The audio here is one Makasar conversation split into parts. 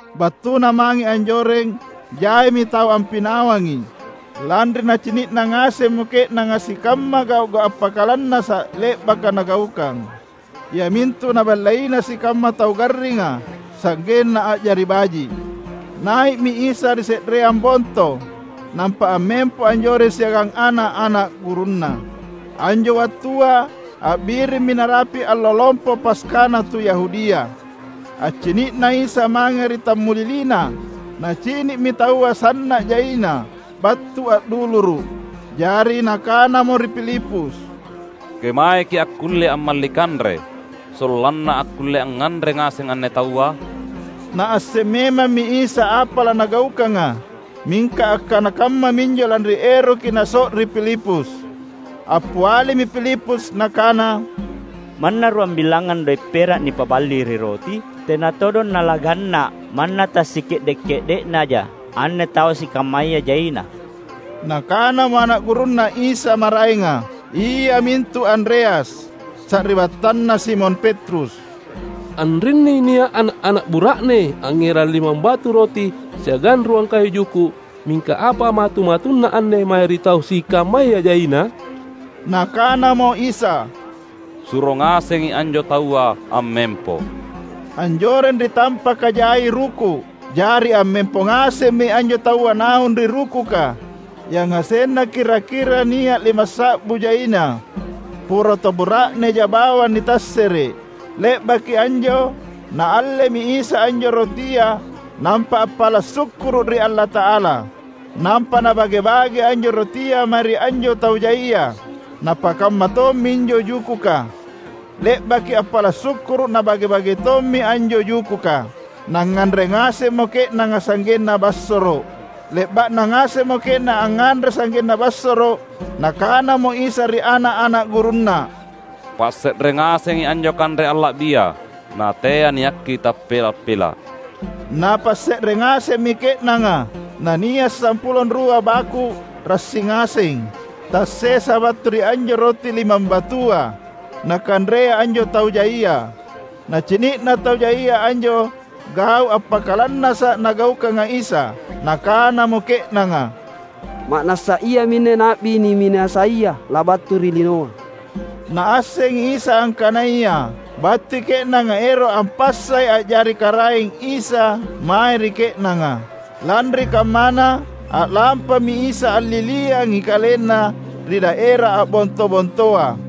Battuna mange anjoreng jaimi tau ampinawangi, lanri nacini’na ngasemmo ke’nanga sikamma gau’-gau’ appakalannasa’ le’baka Nagaukang, iamintu Naballeina sikamma tau garringa sa’genna a’jari baji’. Nai’mi Isa ri se’reang Bonto, nampa ammempo anjoreng siagang ana’-ana’ gurunNa. Anjo wattua, a’birimmi narapi’ Allo Lompo Paskana tu Yahudia. Accini’na Isa mange ri tammuliliNa, Nacini’mi taua sanna’ jaina battu a’duluru’. Jari Nakanamo ri Filipus, "Kemaeki’ akkulle ammalli kanre, sollanna akkulle angnganre ngaseng anne taua?" (Naasseng memammi Isa apa laNagaukanga, mingka akkanakammaminjo lanri eroki Naso’ri Filipus.) Appialimi Filipus nakana, "Manna ruambilangngang doe’ pera’ nipaballi ri roti, tena todong nalaganna’ manna tassike’de’-ke’de’naja anne tau sikammaya jaina." Nakanamo ana’ gurunNa Isa maraenga, iamintu Andreas, sari’battanna Simon Petrus, "Anrinni nia’ ana’-ana’ bura’ne angngerang limambatu roti siagang ruang kayu juku’. Mingka apa matu-matunna anne mae ri tau sikammaya jaina?" Nakanamo Isa, "Suro ngasengi anjo taua ammempo." Anjoreng ri tampaka jai ruku’. Jari ammempo ngasemmi anjo taua naung ri rukuka — yangasenna kira-kira nia’ limassa’bu jaina poro tau bura’neja bawang nitassere’ –. Le’baki anjo, Naallemi Isa anjo rotia nampa appala’ sukkuru’ ri Allata’ala. Nampa Nabage-bage anjo rotia mae ri anjo tau jaia. Napakamma tomminjo jukuka; le’baki appala’ sukkuru’ Nabage-bage tommi anjo jukuka. Nangnganre ngasemmo ke’nanga sa’genna bassoro’. Le’ba’na ngasemmo ke’nanga angnganre sa’genna bassoro’, Nakanamo Isa ri ana’-ana’ gurunNa, "Passe’re ngasengi anjo kanre alla’bia, natea niakki tappela’-pela’." Napasse’re ngasemmi ke’nanga, na nia’ sampulo anrua baku’ rassi ngaseng tassesa battu ri anjo roti limambatua, nakanrea anjo tau jaia. Nacini’na tau jaia anjo gau’ appakalannasa’ Nagaukanga Isa, nakanamo ke’nanga, "Ma’nassa Iaminne Na’bi niminasaia labattu ri linoa!" Naassengi Isa angkanaya battui ke’nanga ero’ ampassai a’jari karaeng Isa mae ri ke’nanga. Lanri kammana, a’lampami Isa alliliangi KalenNa ri daera a’bonto-bontoa.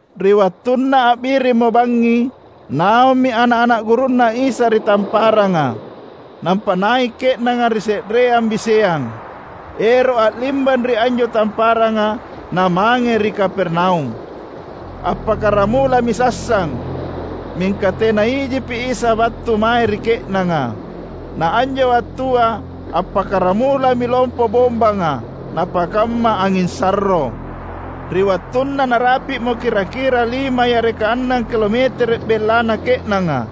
Ri wattunna a’birimmo bangngi, naummi ana’-ana’ gurunNa Isa ri tamparanga. Nampa nai’ ke’nanga ri se’reang biseang, ero’ a’limbang ri anjo tamparanga namange ri Kapernaum. Appakkaramulami sassang, mingka tena ijipi Isa battu mae ri ke’nanga. Na anjo wattua appakkaramulami lompo bombanga napakamma anging sarro. Ri wattunna narapi’mo kira-kira lima yareka annang kilometere’ bellana ke’nanga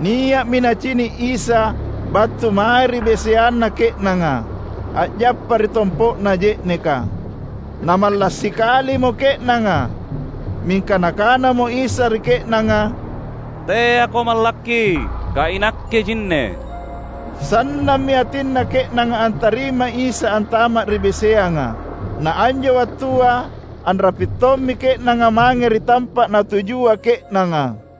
nia’mi nacini’ Isa battu mae ri biseanna ke’nanga, a’jappa ri tompo’na je’neka. Namalla’ sikalimo ke’nanga. Mingka Nakanamo Isa ri ke’nanga, "Teako mallakki, kaiNakke jinne!" Sannammi atinna ke’nanga antarimai Isa antama’ ri biseanga. Na anjo wattua anrapi’ tommi ke’nanga mange ri tampa’ natujua ke’nanga.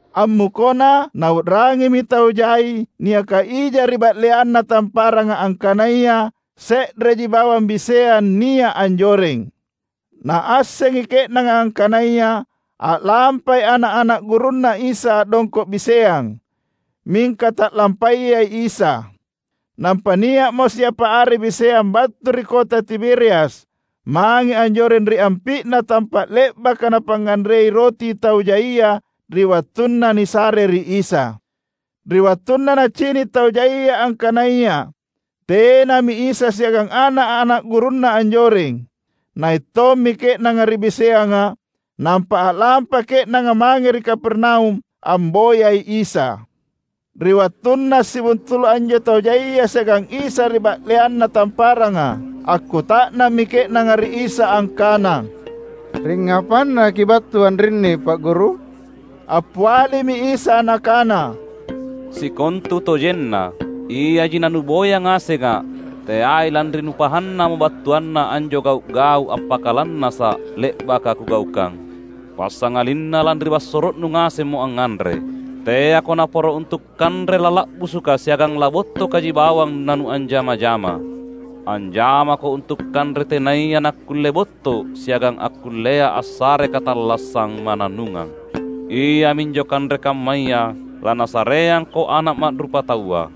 Ammukona, nau’rangimi tau jai niaka ija ri ba’leanna tamparanga angkanaya se’reji bawang biseang nia’ anjoreng. Naassengi ke’nanga angkanaya a’lampai ana’-ana’ gurunNa Isa a’dongko’ biseang, mingka ta’lampayai Isa. Nampa nia’mo siapa are biseang battu ri kota Tiberias mange anjoreng ri ampi’na tampa’ le’baka napangnganrei roti tau jaia ri wattunna nisare ri Isa. Ri wattunna nacini’ tau jaia angkanaya tenami Isa siagang ana’-ana’ gurunNa anjoreng, nai’ tommi ke’nanga ri biseanga nampa a’lampa ke’nanga mange ri Kapernaum amboyai Isa. Ri wattunna assibuntulu’ anjo tau jaia siagang Isa ri ba’leanna tamparanga, akkuta’nammi ke’nanga ri Isa angkana, "Ringngapanna Kibattu anrinni Pa’ Guru?" Appialimi Isa Nakana, "Sikontutojenna, iaji nanuboya ngasengA’, teai lanri nupahannamo battuanna anjo gau’-gau’ appakalannasa’ le’baka Kugaukang, passangalinna lanri bassoro’nu ngasemmo angnganre. Teako naporo untu’ kanre lala’busuka siagang labottokaji bawang nanuanjama-jama. Anjamako untu’ kanre tenaya nakkulle botto’ siagang akkullea assare katallassang mannannungang. Iaminjo kanre kammaya laNasareangko Ana’ Ma’rupataua,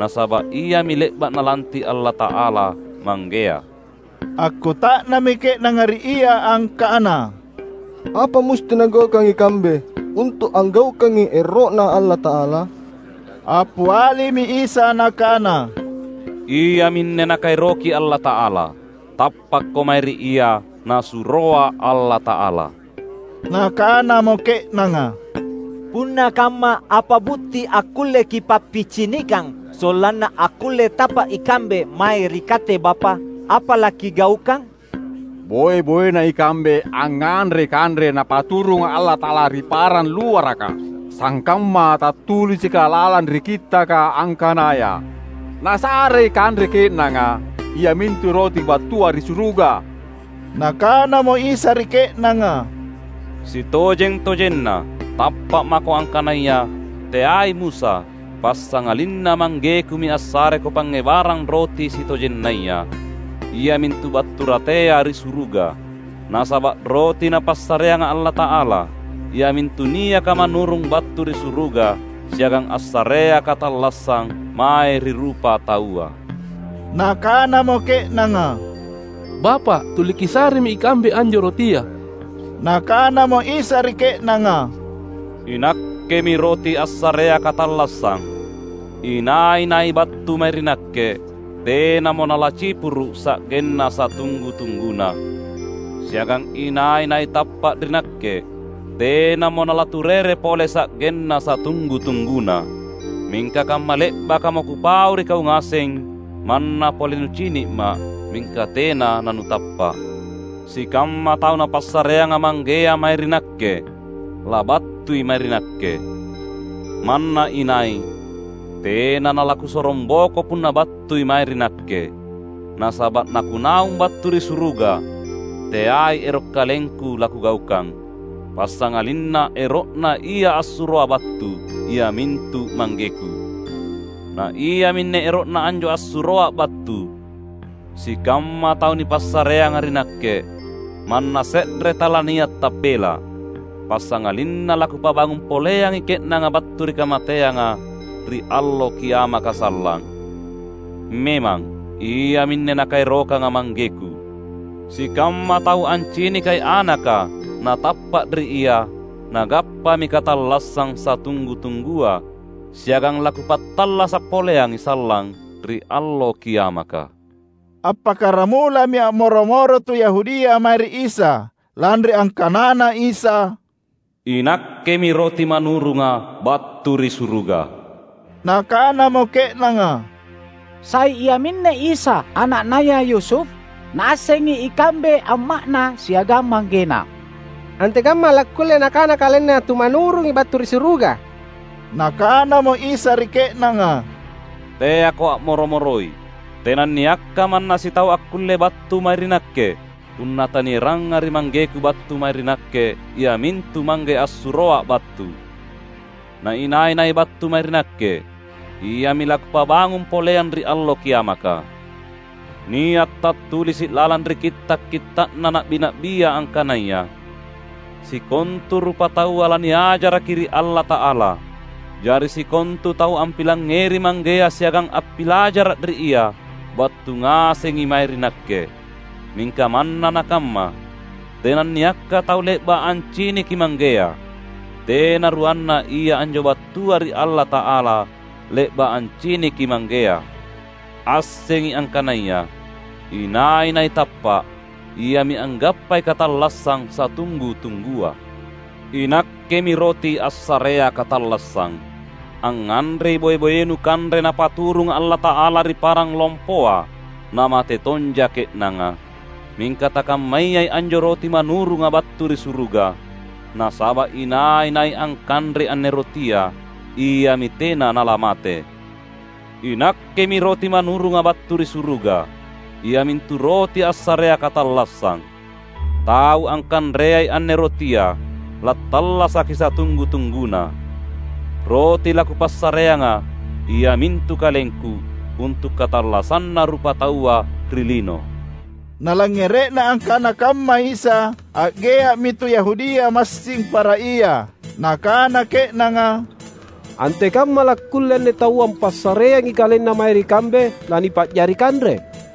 nasaba’ Iami le’ba’ Nalanti’ Allata’ala Manggea." Akkuta’nammi ke’nanga ri Ia angkana, "Apa musti nagaukang ikambe, untu’ anggaukangi ero’Na Allata’ala?" Appialimi Isa Nakana, "Iaminne Nakaeroki Allata’ala: tappakko mae ri Ia Nasuroa Allata’ala." Nakanamo ke’nanga, "Punna kamma, apa butti akkulle Kipappicinikang sollanna akkulle tappa’ ikambe mae ri Katte Bapa’? Apa laKigaukang? Boe-boena ikambe angnganrei kanre Napaturunga Allata’ala ri parang luaraka. Sangkamma tattulisika lalang ri Kittaka angkanaya, ‘Nasarei kanre ke’nanga, iamintu roti battua ri suruga.’" Nakanamo Isa ri ke’nanga, "Sitojeng-tojenna, tappa’ mako angkanaya, teai Musa, passangalinna ManggeKumi assareko pangngebarang roti sitojennaya, iamintu battu ratea ri suruga. Nasaba’ roti Napassareanga Allata’ala, Iamintu niaka manurung battu ri suruga, siagang assarea katallassang mae ri rupataua." Nakanamo ke’nanga, "Bapa’, tuli Kisaremi ikambe anjo rotia." Nakanamo Isa ri ke’nanga, "INakkemi roti assarea katallassang. Inai-nai battu mae ri Nakke, tenamo nalacipuru’ sa’genna satunggu-tungguna. Siagang inai-nai tappa’ ri Nakke, tenamo nalaturere pole sa’genna satunggu-tungguna." "Mingka kamma le’bakamo Kupau ri kau ngaseng, manna pole nucini’Ma’, mingka tena nanutappa’. Sikamma tau Napassareanga Manggea mae ri Nakke, labattui mae ri Nakke. Manna inai tena nalaKusorongboko punna battui mae ri Nakke. Nasaba’ naKunaung battu ri suruga, teai ero’ KalengKu laKugaukang, passangalinna ero’Na Ia assuroA’ battu, iamintu ManggeKu. Na iaminne ero’Na anjo assuroA’ battu: sikamma tau nipassareanga ri Nakke, manna se’re talania’ tappela’; passangalinna laKupabangung poleangi ke’nanga battu ri kamateanga, ri Allo Kiamaka sallang. Memang, iaminne Nakaerokanga ManggeKu: Sikamma tau ancinikai Anaka na tappa’ ri Ia, nagappami katallassang satunggu-tunggua, siagang laKupattallasa’ poleangi sallang ri Allo Kiamaka." Appakkaramulami a’moro-moro tu Yahudia mae ri Isa, lanri angkanaNa Isa, "INakkemi roti manurunga battu ri suruga." Nakanamo ke’nanga, "Sai iaminne Isa, ana’naya Yusuf? Naassengi ikambe amma’Na siagang manggeNa! Antekamma lakkulle Nakana KalenNa tu manurungi battu ri suruga?" Nakanamo Isa ri ke’nanga, "Teako a’moro-moroi. Tenanniakka manna sitau akkulle battu mae ri Nakke, punna tanieranga ri ManggeKu battu mae ri Nakke iamintu Mangge assuroA’ battu; na inai-nai battu mae ri Nakke, iami laKupabangung poleang ri Allo Kiamaka. Nia’ tattulisi’ lalang ri Kitta’-kitta’na Na’bi-na’bia angkanaya, ‘Sikontu rupataua laniajaraki ri Allata’ala.’ Jari sikontu tau ampilangngeri Manggea siagang appilajara’ ri Ia, battu ngasengi mae ri Nakke. Mingka manna nakamma, tenanniakka tau le’ba’ anciniki Manggea. Tena ruanna Ia anjo battua ri Allata’ala, le’ba’ anciniki Manggea. Assengi angkanaya: Inai-nai tappa’, iami anggappai katallassang satunggu-tunggua. INakkemi roti assarea katallassang. Angnganrei boe-boenu kanre Napaturunga Allata’ala ri parang lompoa, namate tonja ke’nanga. Mingka takammayai anjo roti manurunga battu ri suruga; nasaba’ inai-nai angkanrei anne rotia iami tena nalamate. INakkemi roti manurunga battu ri suruga iamintu roti assarea katallassang. Tau angkanreai anne rotia lattallasaki satunggu-tungguna. Roti laKupassareanga iamintu KalengKu, untu’ katallassanna rupataua ri lino." Nalangngere’na akkana kamma Isa, a’gea’mi tu Yahudia massing para ia. Nakana ke’nanga, "Antekamma lakkulle anne taua ampassareangi KalenNa mae ri kambe lanipa’jari kanre?"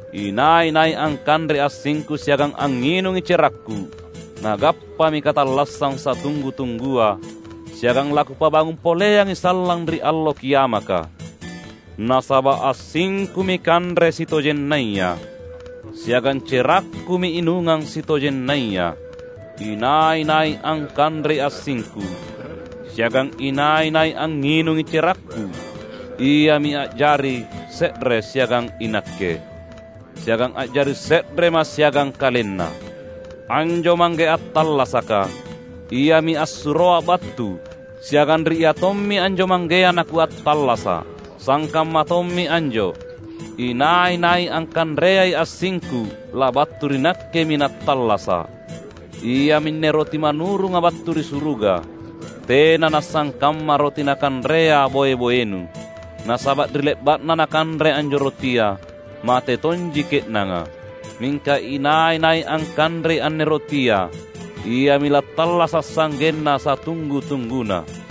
Inai-nai angkanrei assingKu siagang angnginungi cerakKu, nagappami katallassang satunggu-tunggua, siagang laKupabangung poleangi sallang ri Allo Kiamaka. Nasaba’ assingKumi kanre sitojennaya, siagang cerakKumi inungang sitojennaya. Inai-nai angkanrei assingku, siagang inai-nai angnginungi cerakKu, iami a’jari se’re siagang iNakke, siagang a’jari se’reMa’ siagang kalenna. Anjo Mangge attallasaka, Iami assuroA’ battu, siagang ri Iatommi anjo Manggea naKuattallasa’. Sangkamma tommi anjo, inai-nai angkanreai assingKu labattu ri Nakkemi nattallasa’. Iaminne roti manurunga battu ri suruga: tena nasangkamma roti nakanrea boe-boenu. Nasaba’ ri le’ba’na nakanre anjo rotia, mate tonji ke’nanga. Mingka inai-nai angkanrei anne rotia iami lattallasa’ sa’genna satunggu-tungguna."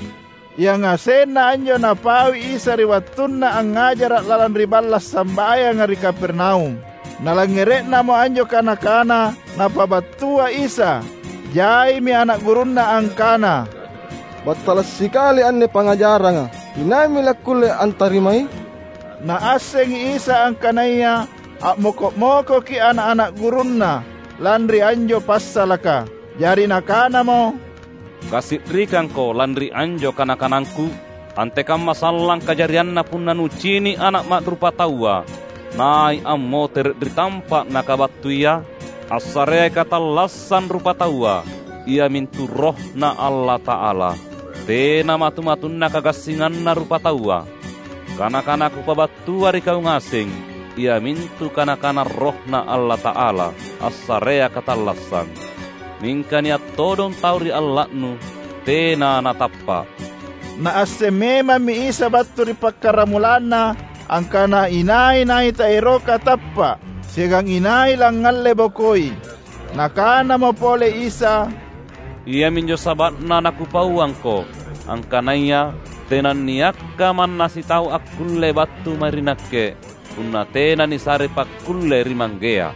Yangasenna anjo Napaui Isa ri wattunNa angngajara’ lalang ri balla’ sambayanga ri Kapernaum. Nalangngere’namo anjo kana-kana Napabattua Isa, jaimi ana’ gurunNa angkana, "Battala’ sikali anne pangngajaranga. Inaimi lakkulle antarimai?" Naassengi Isa angkanaya a’moko’-mokoki ana’-ana’ gurunNa lanri anjo passalaka. Jari Nakanamo, "Kasi’rikangko lanri anjo kana-kanangKu? Antekamma sallang kajarianna punna nucini’ Ana’ Ma’rupataua nai’ ammotere’ ri tampa’ Nakabattuia? Assareai katallassang rupataua iamintu RohNa Allata’ala. Tena matu-matunna kagassinganna rupataua. Kana-kana Kupabattua ri kau ngaseng iamintu kana-kana RohNa Allata’ala, assarea katallassang. Mingka nia’ todong tau ri alla’nu tena natappa’." (Naasseng memammi Isa battu ri pakkaramulanna angkana inai-nai taeroka tappa’, siagang inai langngalle-bokoi.) Nakanamo pole Isa, "Iaminjo saba’na naKupauangko angkanaya tenanniakka manna sitau akkulle battu mae ri Nakke punna tena nisarei pakkulle ri Manggea."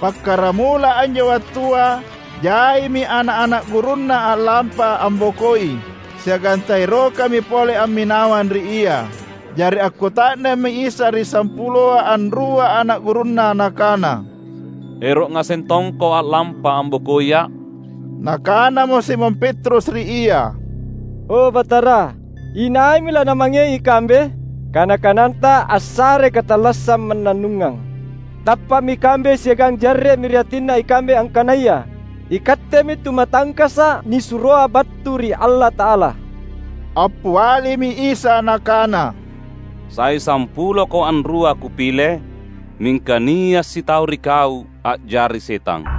Pakkaramula anjo wattua jaimi ana’-ana’ gurunNa a’lampa ambokoi, siagang taerokami pole amminawang ri Ia. Jari akkuta’nammi Isa ri sampuloa anrua ana’ gurunNa Nakana, "Ero’ ngaseng tongko a’lampa ambokoiA’?" Nakanamo Simon Petrus ri Ia, "O Batara, inaimi lanamangei ikambe? Kana-kananTa assarei katallassang mannannungang. Tappa’mi ikambe siagang jarre’mi ri atinna ikambe angkanaya iKattemi Tu Matangkasa’ nisuroa battu ri Allata’ala." Appialimi Isa Nakana, "Sai sampuloko anrua Kupile? Mingka nia’ sitau ri kau a’jari setang!"